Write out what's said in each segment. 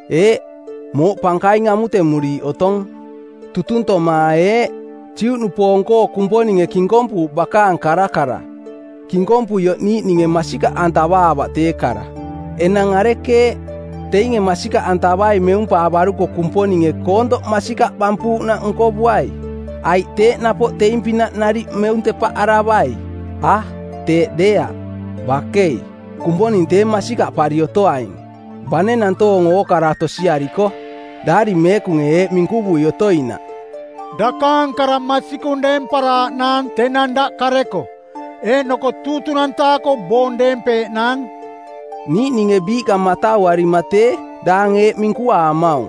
Eeꞌ, mooꞌ pankaing amutemuriiꞌ otong. Tutuntoma eeꞌ: Juꞌnupoong-koo Kumponinge kinkompuuꞌ bakaang karakara. Kinkompuioꞌ niiꞌninge masikaꞌantavaavaꞌ tee kara. Enang arekeeꞌ, teinge masikaꞌantavai meumpaavaruko Kumponinge koontoꞌ masikaꞌ bampuuꞌnaꞌ nkovuai? Aiꞌ teeꞌ napoꞌ teing-pinaꞌ nariꞌ meuntepaꞌaravai? A, teeꞌ deeaꞌ, bakei! Kumponing tee masikaꞌpari otoaing, bane nantoong ookara tosiariko. Daari Meekunge eeꞌ minkuvui otoinaꞌ, “Dakaang kara masikung deemparaaꞌnaang tenang daꞌ kareko, eeꞌnoko tuutunantaako boong deempeeꞌnaang.” Niiꞌninge biiꞌka matauarima tee, daang eeꞌ minkuaamaung,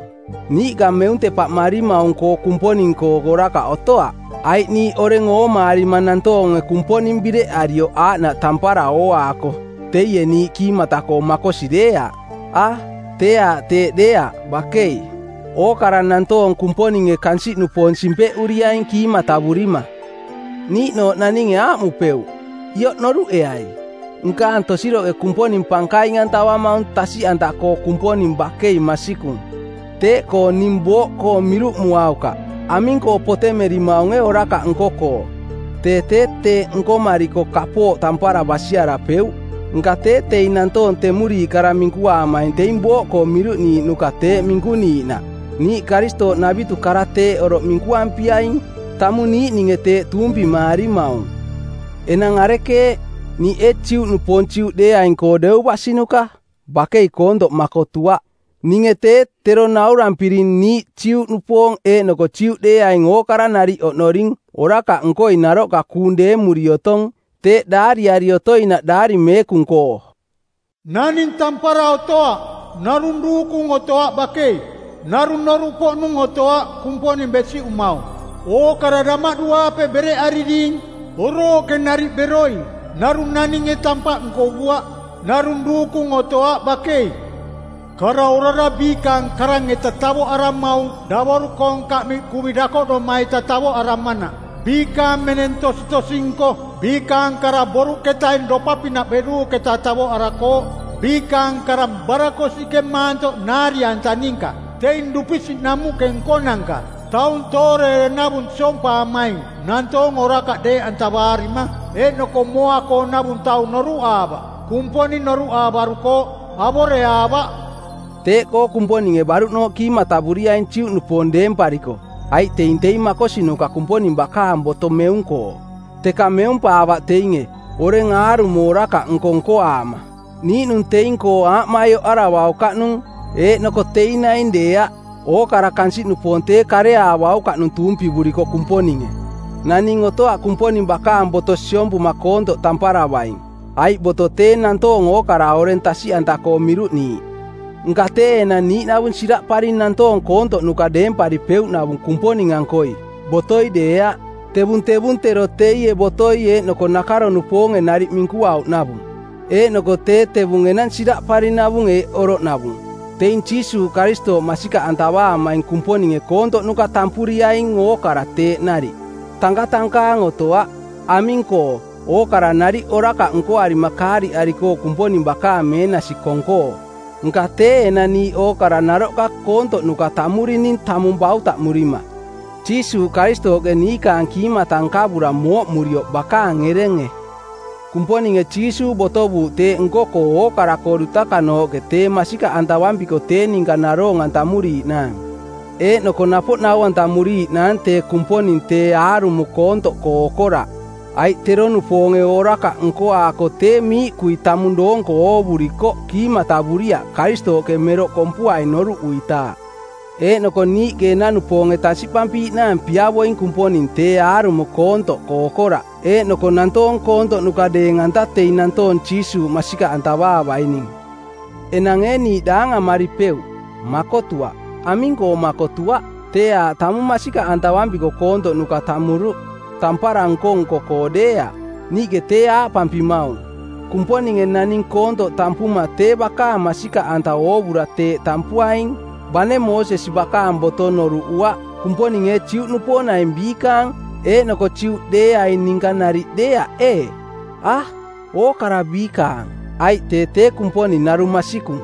“Niiꞌka meuntepaꞌmarimaung-koo Kumponing-koo orakaꞌ otoaꞌ, aiꞌ niiꞌ oreng oomaarima nantoonge Kumponing bireꞌarioꞌ aaꞌnaꞌ tampara ooaako teie niiꞌ kiimata-koo makosi deeaꞌ.” A, tee aaꞌ teeꞌ deeaꞌ, bakei! Ookara nantoong Kumponinge kansiꞌnupoong simpeꞌuriaing kiimatavurima. Niiꞌnooꞌ naninge aaꞌmupeuꞌ, “Ioꞌ noruꞌeai: Nkaang tosiroꞌke Kumponing pankaing-antavumaung tasiꞌanta-koo Kumponing bakei masikung. Teeꞌkoo ning booꞌkoo miruꞌmuaukaꞌ. Aming-koo potemerimaunge orakaꞌ nko-koo? Tee tee teeꞌ nkomariko kapooꞌ tampara basiarapeuꞌ.” Nka tee teing nantoong temuriiꞌ kara minkuaamaing teing booꞌkoo miruꞌniiꞌnuka teꞌ minkuniiꞌnaꞌ. Niiꞌ Karistooꞌnavitu kara teeꞌ oroꞌ minkuampiaing. Tamung niiꞌninge teeꞌ tuumpimaarimaung. Enang arekeeꞌ, niiꞌ ee Juꞌnupoong Juꞌdeeaing-koo deu basinuka? Bakei koontoꞌ makotuaꞌ. Ninge tee, tero naurampiring niiꞌ Juꞌnupoong eeꞌnoko Juꞌdeeaing ookara nariꞌ oꞌnoring orakaꞌnkoi naroꞌka kuung deemuri otong. Teeꞌ daariari otoinaꞌ Daari Meekung-koo, “Naning tampara otoaꞌ, narung duukung otoaꞌ bakei. Narung noruꞌpoꞌnung otoaꞌ Kumponing besiꞌumaung. Ookara damaꞌdu-aape bereꞌariring, orooꞌke nariꞌ beroing. Narung naninge tampaꞌ nkovuaꞌ. Narung duukung otoaꞌ bakei. Kara orara biikaang karang-eta tavoꞌaramaung davoru-koong kaꞌmiꞌ kuvi dakoꞌdoma-eta tavoꞌaramanaꞌ. Biikaang meneng tositosi-nko. Biikaang kara boruꞌketaing dopa-pinaꞌ beruuꞌketa tavoꞌarakooꞌ. “Biikaang karang barakosiꞌke maantoꞌ naari-anta ninka. Teing dupisiꞌ namuꞌke nkonanka. ‘Taung tooreere navung siompaamaing nantoong orakaꞌ deeꞌantavaarima. ‘Eeꞌnoko mooa-koonavung taung noruꞌaavaꞌ. “Kumponing noruꞌaavarukooꞌ, avoreaavaꞌ.” Teeꞌkoo Kumponinge baruꞌnooꞌ kiimatavuriaing Juꞌnupoong deempariko aiꞌ teing teing makosinuka Kumponing bakaang boto meung-koo, teka meumpaavaꞌ teinge, oreng aarumo orakaꞌnko nkoaama. Niiꞌnung teing-koo aaꞌmaioꞌaravaukaꞌnung. Eeꞌnoko teing naing deeaꞌ, ookara kansiꞌnupoong tee kareaavaukaꞌnung tuumpivuriko Kumponinge. Naning otoaꞌ Kumponing bakaang boto siompuma koontoꞌ tamparavaing, aiꞌ boto tee nantoong ookara oreng tasiꞌanta-koo miruꞌniiꞌ. Nka tee enang niiꞌnavung siraꞌparing nantoong koontoꞌnuka deemparipeuꞌnavung Kumponing-ankoi, botoi deeaꞌ. Tevung tevung tero teie botoi eeꞌnoko nakaro-nupoonge nariꞌ minkuauꞌnavung. Eeꞌnoko tee tevung enang siraꞌparinavung eeꞌ oroꞌnavung: Teing Jiisuuꞌ Karistooꞌ masikaꞌantavaamaing Kumponinge koontoꞌnuka tampuriaing, ookara teeꞌ nariꞌ. Tankatankaang otoaꞌ. Aming-koo, ookara nariꞌ orakaꞌ nkoarima kaariꞌarikooꞌ Kumponing bakaang meenasi kong-koo. Nka tee enang niiꞌ ookara naroꞌka koontoꞌnuka tammurining tamung bautaꞌmurima, Jiisuuꞌ Karistooꞌke niikaang kiimata nkavura mooꞌmurioꞌ bakaang erenge. Kumponinge Jiisuuꞌ botovuuꞌ teeꞌ nko-koo ookara-koo dutakanooꞌke tee masikaꞌ antavampiko tee ninka naroong-antamuriiꞌnaang, eeꞌnoko napoꞌ nau-antamuriiꞌnaang tee Kumponing tee aarumo koontoꞌkoo okoraꞌ, aiꞌ tero-nupoonge orakaꞌnko nkoaako tee miiꞌkui tamung doonko oovurikoꞌ kiimatavuriaꞌ Karistooꞌke meroꞌ kompuaing noruꞌuitaaꞌ. Eeꞌnoko niiꞌke enanupoonge tasiꞌpampiiꞌnaang piavoing Kumponing tee aarumo koontoꞌkoo okoraꞌ eeꞌnoko nantoong koontoꞌnuka deeng-anta teing nantoong Jiisuuꞌ masikaꞌantavaavaining. Enang ee niiꞌ daangamaripeuꞌ? Makotuaꞌ. Aming-koo makotuaꞌ? Tee aaꞌ tamung masikaꞌantavampiko koontoꞌnuka tammuruꞌ, tampara nko-nko-koo deeaꞌ. Niiꞌke tee aaꞌpampimaung: Kumponinge naning koontoꞌ tampuma tee bakaang masikaꞌanta oovura teeꞌ tampuaing, bane Moosesi bakaang boto noruꞌuaꞌ. Kumponing ee Juꞌnupoong naing biikaang, eeꞌnoko Juꞌdeeaing ninka nariꞌ deeaꞌ, ee? A, ookara biikaang, aiꞌ tee tee Kumponing narung masikung.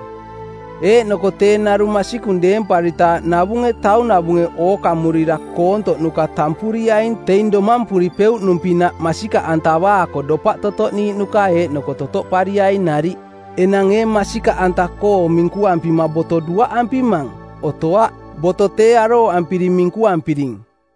Eeꞌnoko tee narung masikung deemparitaaꞌ navunge taunavunge ookamurira koontoꞌnuka tampuriaing teing domampuripeuꞌnung-pinaꞌ masikaꞌantavaako dopaꞌ totoꞌniiꞌnuka eeꞌnoko totoꞌpariaing nariꞌ. Enang ee masikaꞌanta-koo minkuampima boto duaꞌampimang? Otoaꞌ. Boto tee arooꞌampiri minkuampiring.